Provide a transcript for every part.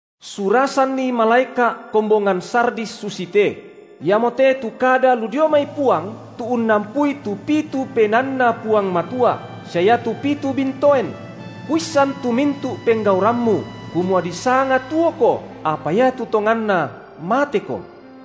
Surasanni malaeka’ kombongan Sardis susite: Iamote tu kada lu dio mai Puang tu unnampui tu pitu PenaanNa Puang Matua, sia iatu pitu bintoen; Kuissan tu mintu’ penggaurammu, kumua disanga tuoko, apa iatu tonganna mateko.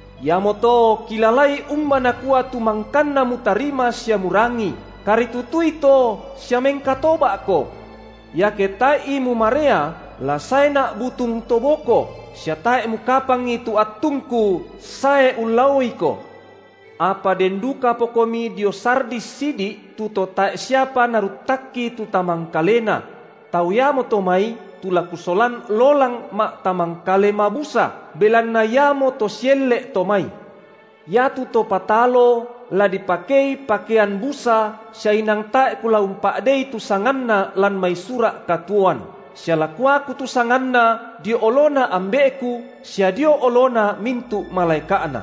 Iamoto, kilalai umba nakua tu mangkanna mutarima sia murangi; karitutui to sia mengkatoba’ko. Iake tae’i mumarea, la saeNa’ butung to boko, sia tae’ mukapangi tu attungKu sae ullaoiko. Apa den dukapakomi dio Sardis sidi’ tu to tae’ siapa naruttakki tu tamangkalena; tau iamo to mai tu la Kusolan lolang ma’tamangkale mabusa, belanna iamoto sielle’ to mai. Iatu to patalo la dipakei pakean busa sia inang tae’ Kula umpa’dei tu sanganna lan mai sura’ katuoan, sia la Kuaku tu sanganna dio oloNa Ambe’Ku sia dio olona mintu’ malaeka’Na.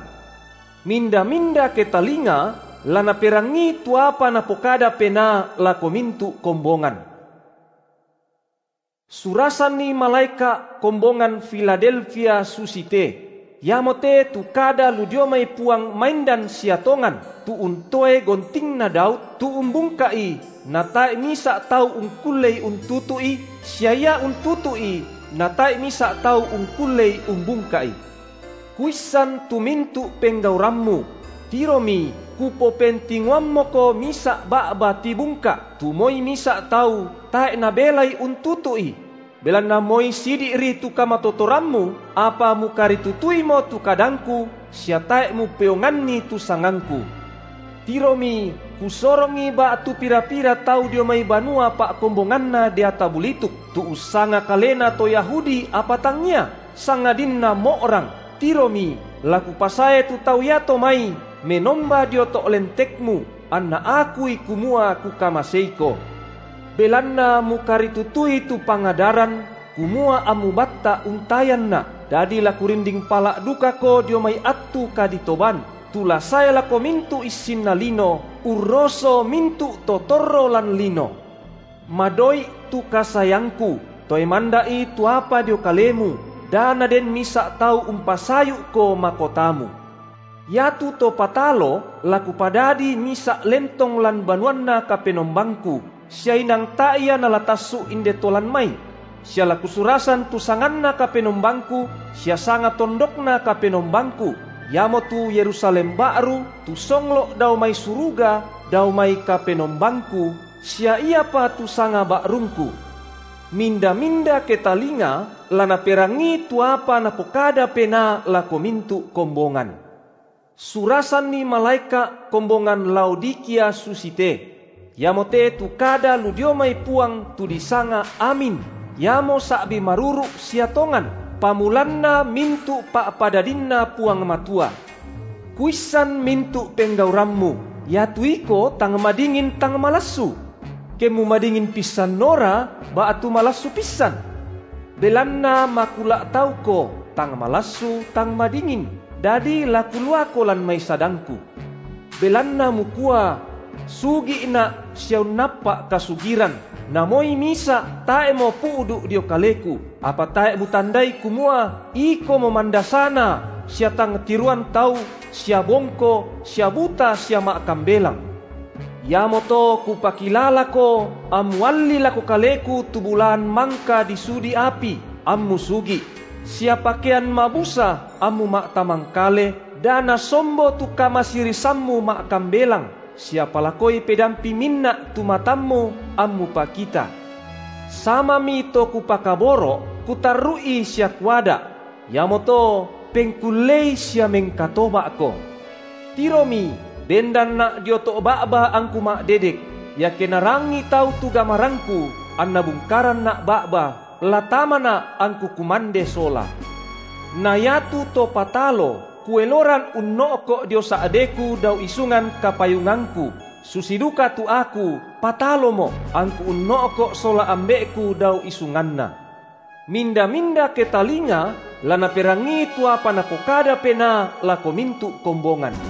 Minda-minda ketalinga, la naperangii tu apa Napokada Penaa lako mintu’ kombongan. Surasanni malaeka’ kombongan Filadelfia susite: Iamote tu kada lu dio mai Puang maindan sia tongan, tu untoe gontingna Daud, tu umbungka’i, nata’e misa’ tau ungkullei untutu’i, sia Ia untutu’i natae’ misa’ tau ungkullei umbungka’i: Kuissan tu mintu’ penggaurammu – tiromi Kupopentingoammoko misa’ ba’ba tibungka’, tu moi misa’ tau tae’ nabelai untutu’i –, belanna moi sidi’ri tu kamatotorammu, apa mukaritutuimo tu kadangKu sia tae’ mupeonganni tu sangangKu. Tiromi, Kusorongi ba’tu pira-pira tau dio mai banua pa’kombonganna deata bulituk, tu ussanga kalena to Yahudi apa tangngia, sangadinna mo’rang, tiromi, la Kupasae tu tau iato mai menomba dio to’ lentekmu, anna akui kumua Kukamaseiko. Belanna mukaritutui tu pangadaran, kumua ammu batta’ untayanNa’, dadi la Kurinding pala’ dukako dio mai attu kaditoban, tu la sae lako mintu’ issinna lino, urroso mintu’ to torro lan lino. Madoi’ tu kasaeangKu, toe manda’i tu apa dio kalemu, da naden misa’ tau umpasayu’ko makotamu. Iatu to patalo, la Kupadadi misa’ lentong lan banuanNa KapenombangKu, sia inang tae’ ia nala tassu’ inde to lan mai; sia la Kusurasan tu sanganNa KapenombangKu sia sanga tondokNa KapenombangKu, iamotu Yerusalem ba’ru tu songlo’ dao mai suruga dao mai KapenombangKu, sia iapa tu sanga ba’rungKu. Minda-minda ketalinga, la naperangii tu apa Napokada Penaa lako mintu’ kombongan. Surasanni malaeka’ kombongan Laodikia susite: Iamote tu kada lu dio mai Puang tu disanga Amin, iamo sa’bi maruru’ sia tongan, pamulanna mintu’ pa’padadinNa Puang Matua. Kuissan mintu’ penggaurammu, iatu iko tang madingin, tang malassu. Kemmu madingin pissanora ba’tu malassu pissan! Belanna makula’ tauko, tang malassu tang madingin, dadi la Kuluako lan mai sadangKu. Belanna mukua: Sugi’na’ sia unnappa’ kasugiran, na moi misa’ tae’mo pu’du’ dio kaleku, apa tae’ mutandai, kumua ikomo mandasana sia tang tiroan tau sia bongko sia buta sia ma’kambelang, iamoto Kupakilalako ammu allii lako Kaleku tu bulaan mangka disudi api, ammu sugi’; sia pakean mabusa, ammu ma’tamangkale, da nasombo tu kamasirisammu ma’kambelang, sia palakoi pedampi minna’ tu matammu, ammu pakita. Samami to Kupakaboro’, Kutarru’i sia Kuada’; iamoto pengkullei sia mengkatoba’ko. Tiromi bendanNa’ dio to’ ba’ba angKu ma’dedek; iake narangii tau tu gamarangKu, anna bungkaranNa’ ba’ba, la tamaNa’ angKu kumande sola. Na iatu to patalo, Kueloran unno’ko’ dio sa’deKu dao isungan kapayungangKu susi duka tu Aku pataloMo’ angKu unno’ko’ sola Ambe’Ku dao isunganNa. Minda-minda ketalinga la naperangii tu apa Napokada Penaa lako mintu’ kombongan.